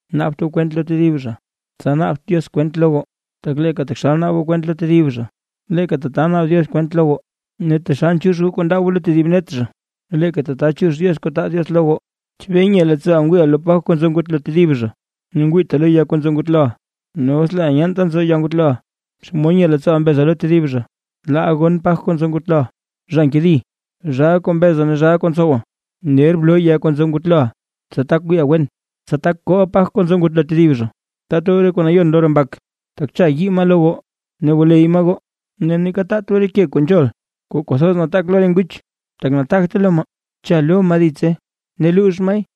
’Naabt goo kwent lo tedib zha, tsa naabt Diox kwent lo goo. Tak leeka taxal naab goo kwent lo tedib zha, leeka tata naab Diox kwent lo goo, ne taxal nchiix goo kuu ndaa goo lo tedib net zha, leeka tata chiix Diox kuu taa Diox lo goo. ¿Chebee nye leettsooʼa ngwiiʼa lo paj kuu nzo ngutlo tedib zha, ne ngwiita lo ya kuu nzo ngutloʼa? Ne os leeʼa nyeenta nzo ya ngutloʼa, ¿xomod nye leettsooʼa mbeza lo tedib zha: “Laa gon paj kuu nzo ngutloʼa”? ¡Zha nkedi, zhaa kuu mbeza ne zhaa kuu ntsowa! Ner bloo ya kuu nzo ngutloʼa, tsa tak wiiʼa wen, tsa tak kooʼa paj kuu nzo ngutlo tedib zha. ’Taat goo re kuu nayon lo re mbak, tak cha yii maa lo goo ne wuley maa goo. Ne neeka taat goo re ke kuu nzhol kuu kwathoz nataak lo re nguch, tak nataagte lo maa, cha lo maa ditse ne luux maay.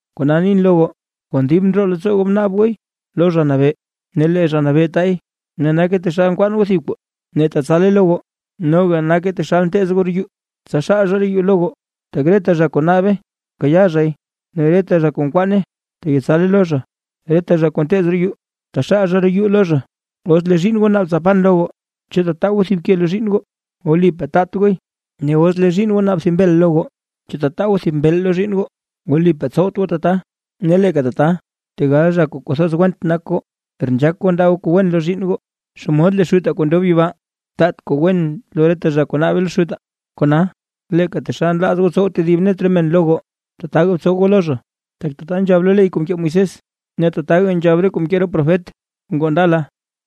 ’Kona nin lo goo, kon dib ndroo leettsoo goo bnaab gooy lo Zha Nabee, ne lee Zha Nabee taay; ne nake taxal nkwaan goo thib kuu ne tatsale lo goo; noga nake taxal nteez goo roo yuu, tsa xaal zha roo yuu lo goo. Tak reta zha kuu naabe nkayaa zhay; ne reta zha kuu nkwaane teyetsale lo zha; ne reta zha kuu nteez roo yuu taxal zha roo yuu lo zha. ’Os lee zhiinn goo naab tsa pan lo goo, ¿chu tataa goo thib ke lo zhiinn goo? Wlipaa taat gooy. Ne os lee zhiinn goo naab thib mbel lo goo, ¿chu tataa goo thib mbeel lo zhiinn goo? Wlipaa tsowt goo tata. Ne leeka tata tegal zha kuu kwathoz went nak goo, per nzhaak goo ndaa goo kuu wen lo zhiinn goo, ¡xomod lee Xutaa kuu ndob yibaa, taat kuu wen lo reta zha kuu naabe lo Xutaa! ’Kona, leeka taxal nlaaz goo tsow tedib net re men lo goo, tataga btsow goo lo zha; tak tata nzhab lo ley kuu mkee Moisés, ne tataka nzhab re kuu mkee re profet kuu ngoo ndala.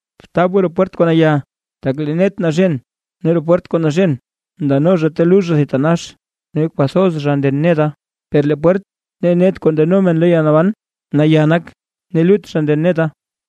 ’Btaab goo roo pwert kuu naya. Tak lee net naxen ne roo pwert kuu naxen, ndano zha ta lux zha thitanax. Ne kwathoz zha nden neta. Per lee pwert ne net kuu ndano men lo yalnaban, naya nak, ne lut zha nden neta.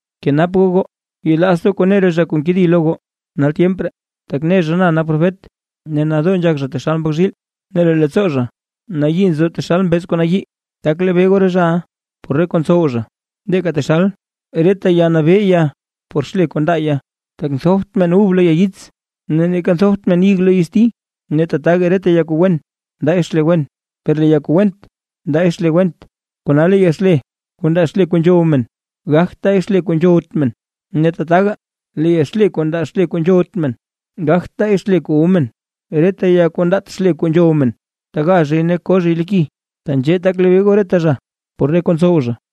’Bkenap goo goo, yelaazt goo kuu ne re zha kuu nkedi lo goo nal tyemp ree: “Tak ne zha na nak profet”. Ne nadoo nzhak zha taxal mbak zhiil, ne lee leettsoo zha nayii nzo taxal mbeez kuu nayii. Tak lebee goo re zhaʼa por re kuu ntsow zha; leeka taxal reta ya nabee ya por xle kuu ndaa ya, tak nthopt men ub lo ya yits, ne neeka nthopt men ig lo yitsti. Ne tataga reta ya kuu wen ndaay xle wen, per lee ya kuu went ndaay xle went. Kona lee ya xle, kuu ndaa xle kuu nzhow men, gagt taay xle kuu nzhowt men, ne tataga lee ya xle kuu ndaa xle kuu nzhowt men, gagt taay xle kuu wu men. Reta ya kuu ndaat xle kuu nzhow men, taga zhay ne ko zhay lo ki. Tenzhee tak lebee goo reta zha, por re kuu ntsow zha.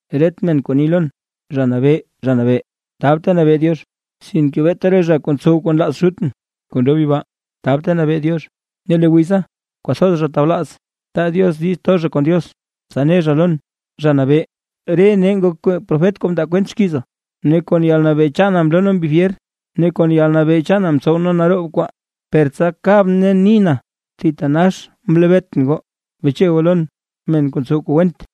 ’Ret men kuu ni lon: “Zha Nabee, Zha Nabee”, tab ta nabee Diox, sinke beeta re zha kuu ntsow kuu nlaaz Xutʼn kuu ndob yibaa, tab ta nabee Diox. Ne lee wiza kwathoz zha tablaaz, taa Diox diiz to zha kon Diox, tsa ne zha lon: “Zha Nabee, re nee ngok profet kuu mndaa kwent xkiiza, ne kon yalnabee chaana mloo nee mbi fyer, ne kon yalnabee chaana mtsow nee naroob kwaa”. Per tsa kabʼn ne nin: “¡Thitanax mlebeetʼn goo, beche goo lon, men kuu ntsow kuu went!”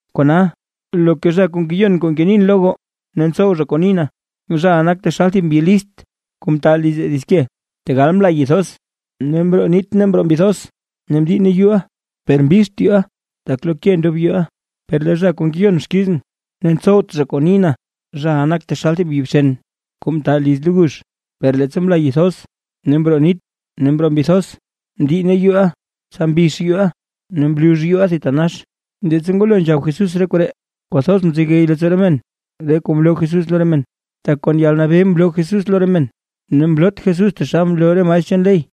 ’Kona, loka zha kuu ngeyon kuu ngenin lo goo, ne ntsow zha kuu nin, zhaʼa nak taxal thib mbyi list kuu mta liz dits ke. Tegal mla yi thoz, ne mroo nit ne mroo mbi thoz, ne mdiinne yuuʼa; per mbixt yuu tak lo ke ndob yuu. Per lee zha kuu ngeyon xkizʼn ne ntsowt zha kuu nin, zhaʼa nak taxal thib mbyi bxen kuu mta liz lo gux. Per leettsa mla yi thoz, ne mroo nit ne mroo mbi thoz, mdiinne yuuʼa, tsa mbix yuuʼa ne mlux yuuʼa thitanax. Leettsa ngwalo nzhab Jesús re koree, kwathoz mzegey leettsoo re men re kuu mloo Jesús lo re men; tak kon yalnabee mloo Jesús lo re men, ne mloot Jesús taxal nloo re maestr chaan ley.